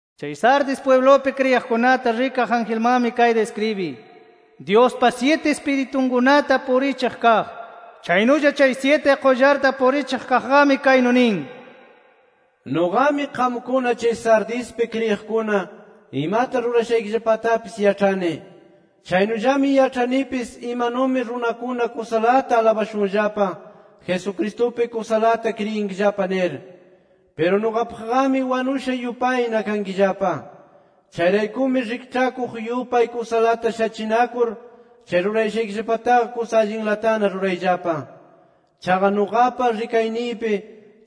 “Chay Sardis pwiblupi kriyiqkunata rikaq angelmanmi kayta iskribiy: Dyuspa syiti Ispiritunkunata purichiq kaq, chaynulla chay syiti qullarta purichiq kaqqami kaynu nin: Nuqami, qamkuna chay Sardispi kriyiqkuna imata rurashaykillapatapis yaĉhani. Chaynullami yaĉhanipis imanumi runakuna kusalata alabashunllapa Jesucristupi kusalata kriyinkillapa nir. Piru nuqapaqqami wanusha yupayna kankillapa. Chayraykumi rikĉhakuq yupay kusalata shachinakur chay rurayashaykillapataqa kusa allinlatana rurayllapa. Chaqa nuqapa rikayniypi,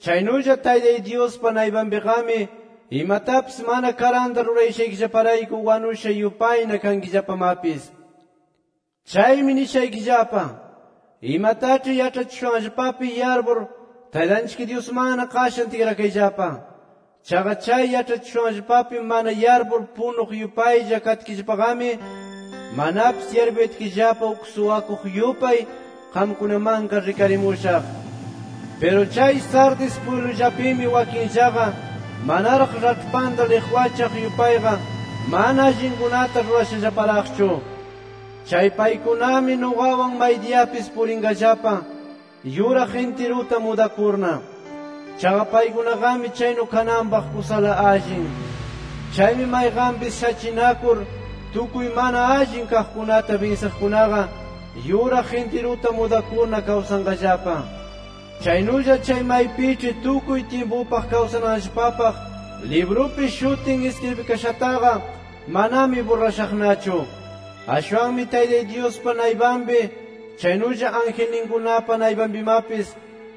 chaynulla Taytay Dyuspa naypanpiqami imatapis mana karanta rurayashaykillaparayku wanusha yupayna kankillapamapis. Chaymi nishaykillapa: Imataĉhi yaĉhachishushanllapapi yarpur Taytanchik Dyusmanna qashan tikrakayllapa. Chaqa chay yaĉhachishushanllapapi mana yarpur punuq yupaylla katkillapaqami manapis yarpuyatkillapa uk suwakuq yupay qamkunamanqa rikarimushaq. Piru chay Sardis pwiblullapimi wakinllaqa manaraq raĉhpanta liqwachaq yupayqa mana allinkunata rurashallaparaqchu. Chay paykunami nuqawan maydiyapis purinqallapa yuraq intiruta mudakurna. Chaqa paykunaqami chaynu kananpaq kusala allin. Chaymi mayqanpis shachinakur tukuy mana allin kaqkunata binsiqkunaqa yuraq intiruta mudakurna kawsanqallapa. Chaynulla chay maypiĉhi tukuy tyimpupaq kawsananllapapaq librupi shutin iskribikashataqa, manami burrashaqnachu. Ashwanmi Taytay Dyuspa naypanpi chaynulla angelninkunapa naypanpimapis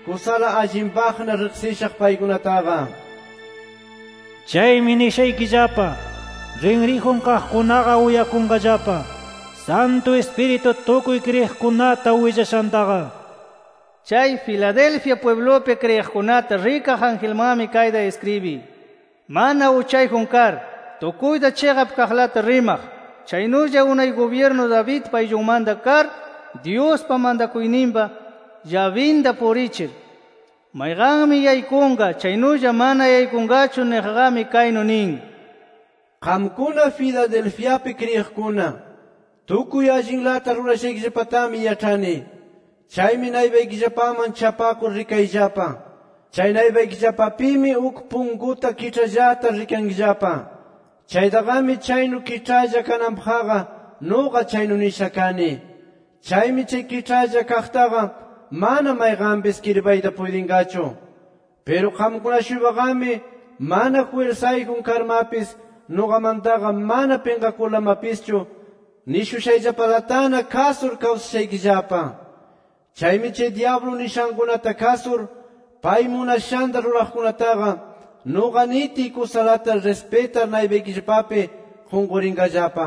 kusala allinpaqna riqsishaq paykunataqa. Chaymi nishaykillapa: ¡Rinriyjun kaqkunaqa uyakunqallapa, Santu Ispiritu tukuy kriyiqkunata willashantaqa! nir. “Chay Filadelfia pwiblupi kriyiqkunata rikaq angelmanmi kayta iskribiy: Mana uchayjun kar, tukuyta chiqap kaqlata rimaq, chaynulla unay gubyirnu Davidpa ayllunmanta kar Dyuspa mantakuyninpa llabinta purichir, mayqanmi yaykunqa chaynulla mana yaykunqachu niqqami, kaynu nin: Qamkuna Filadelfiapi kriyiqkuna tukuy allinlata rurashaykillapatami yaĉhani. Chaymi naypaykillapaman chapakur rikayllapa. Chay naypaykillapapimi uk punkuta kiĉhallata rikankillapa. Chaytaqami chaynu kiĉhalla kananpaqqa, nuqa chaynu nisha kani. Chaymi chay kiĉhalla kaqtaqa mana mayqanpis kirpayta puytinqachu. Piru qamkuna-shuypaqami, mana jwirsayjun karmapis nuqamantaqa mana pinqakurlamapischu, nishushayllapalatana kasur kawsashaykillapa. Chaymi chay dyablu nishankunata kasur, pay munashanta ruraqkunataqa, nuqa nitiy kusalata rispitar naypaykillapapi qunqurinqallapa.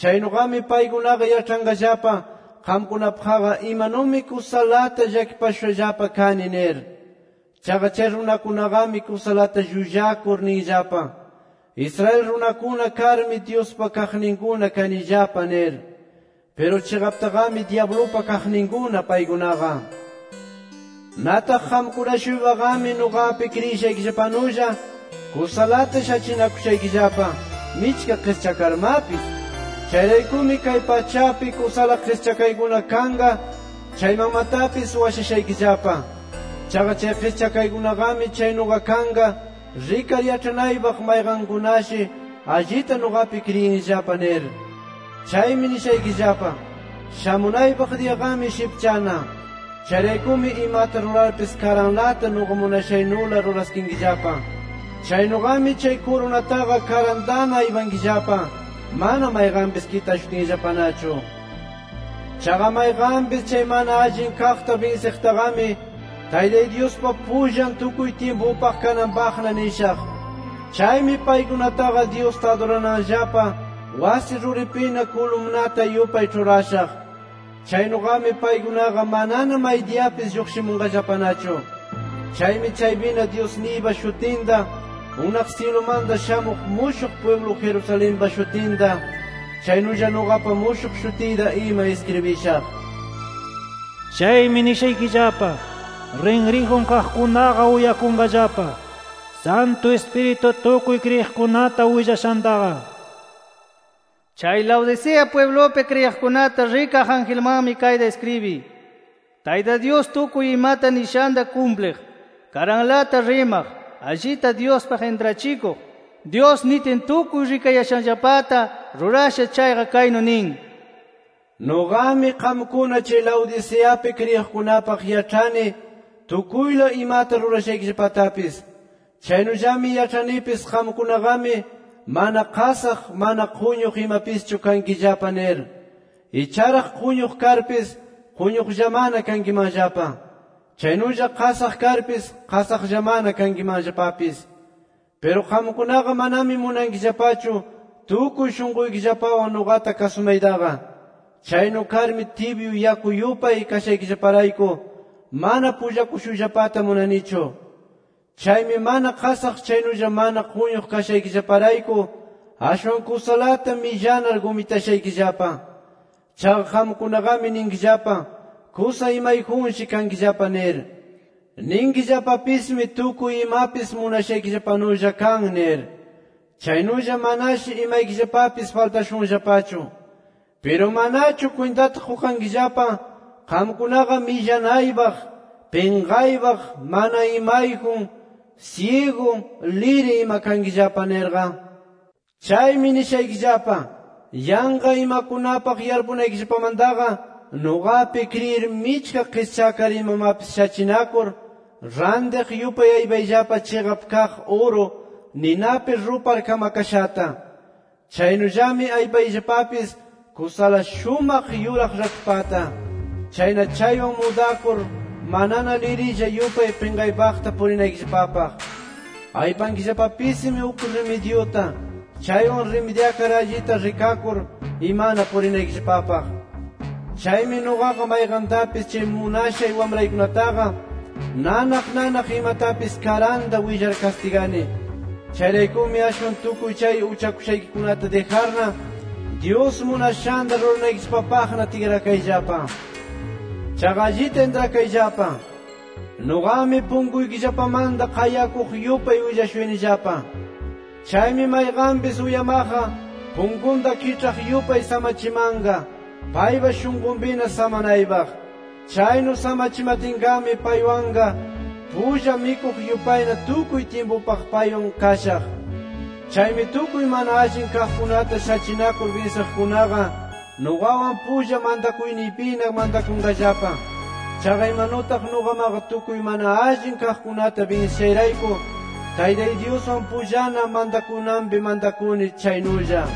Chaynuqami paykunaqa yaĉhanqallapa qamkunapaqqa imanumi kusalata llakipashushallapa kani nir. Chaqa chay runakunaqami kusalata llullakur ninllapa: Israel runakuna karmi Dyuspa kaqninkuna kanillapa nir. Piru chiqaptaqami dyablupa kaqninkuna paykunaqa. Nataq qamkuna-shuypaqami nuqapi kriyishaykillapanulla kusalata shachinakushaykillapa, michka qischakarmapis. Chayraykumi kay pachapi kusala qischakaykuna kanqa chaymanmatapis washashaykillapa. Chaqa chay qischakaykunaqami chaynuqa kanqa rikar yaĉhanaypaq mayqankunashi allita nuqapi kriyinllapa nir. Chaymi nishaykillapa: Shamunaypaq diyaqami shipchana. Chayraykumi imata rurarpis karanlata nuqa munashaynula ruraskinkillapa. Chaynuqami chay kurunataqa karantana aypankillapa, mana mayqanpis kitashutinllapanachu. Chaqa mayqanpis chay mana allin kaqta binsiqtaqami, Taytay Dyuspa pullan tukuy tyimpupaq kananpaqna nishaq. Chaymi paykunataqa Dyusta adurananllapa wasi ruripina kulumnata yupay ĉhurashaq. Chaynuqami paykunaqa manana maydiyapis lluqshimunqallapanachu. Chaymi chaypina Dyusniypa shutinta, unaq syilumanta shamuq mushuq pwiblu Jerusalenpa shutinta, chaynulla nuqapa mushuq shutiyta ima iskribishaq. Chaymi nishaykillapa: ¡Rinriyjun kaqkunaqa uyakunqallapa, Santu Ispiritu tukuy kriyiqkunata willashantaqa! nir. “Chay Laodicea pwiblupi kriyiqkunata rikaq angelmanmi kayta iskribiy: Tayta Dyus tukuy imata nishanta kumpliq, karanlata rimaq, allita Dyuspaq intrachikuq, Dyus nitin tukuy rikayashanllapata rurasha chayqa kaynu nin: Nuqami, qamkuna chay Laodiceapi kriyiqkunapaq yaĉhani tukuyla imata rurashaykillapatapis. Chaynullami yaĉhanipis qamkunaqami mana qasaq, mana quñuq imapischu kankillapa nir. ¡Icharaq quñuq karpis quñuqllamana kankimanllapa! ¡Chaynulla qasaq karpis, qasaqllamana kankimanllapapis! Piru qamkunaqa manami munankillapachu tukuy shunquykillapawan nuqata kasumaytaqa. Chaynu karmi tibyu yaku yupay kashaykillaparayku, mana pullakushuyllapata munanichu. Chaymi mana qasaq chaynulla mana quñuq kashaykillaparayku ashwan kusalata millanar gumitashaykillapa. Chaqa qamkunaqami ninkillapa kusa imayjunshi kankillapa nir. Ninkillapapismi tukuy imapis munashaykillapanulla kan nir. Chaynulla manashi imaykillapapis faltashunllapachu. Piru manachu kwintata qukankillapa qamkunaqa millanaypaq, pinqaypaq, mana imayjun, syigu, liri ima kankillapa nirqa. Chaymi nishaykillapa: Yanqa imakunapaq yarpunaykillapamantaqa, nuqapi kriyir michka qischakar imamapis shachinakur, rantiq yupay aypayllapa chiqap kaq uru, ninapi rupar kamakashata. Chaynullami aypayllapapis kusala shumaq yuraq raĉhpata. Chayna chaywan mudakur manana lirilla yupay pinqaypaqta purinaykillapapaq. Aypankillapapismi uk rimidyuta, chaywan rimidyakar allita rikakur imana purinaykillapapaq. Chaymi nuqaqa mayqantapis chay munashay wamraykunataqa nanaq nanaq imatapis karanta willar kastigani. Chayraykumi ashwan tukuy chay uchakushaykikunata dijarna, Dyus munashanta ruranaykillapapaqna tikrakayllapa. Chaqa allita intrakayllapa: Nuqami punkuykillapamanta qayakuq yupay willashuyanillapa. Chaymi mayqanpis uyamaqqa punkunta kiĉhaq yupay samachimanqa paypa shunqunpina samanaypaq. Chaynu samachimatinqami paywanqa pulla mikuq yupayna tukuy tyimpupaq paywan kashaq. Chaymi tukuy mana allin kaqkunata shachinakur binsiqkunaqa nuqawan pulla mantakuyniypina mantakunqallapa. Chaqa imanutaq nuqamaqa tukuy mana allin kaqkunata binsishayrayku Taytay Dyuswan pullana mantakunanpi mantakuni chaynulla.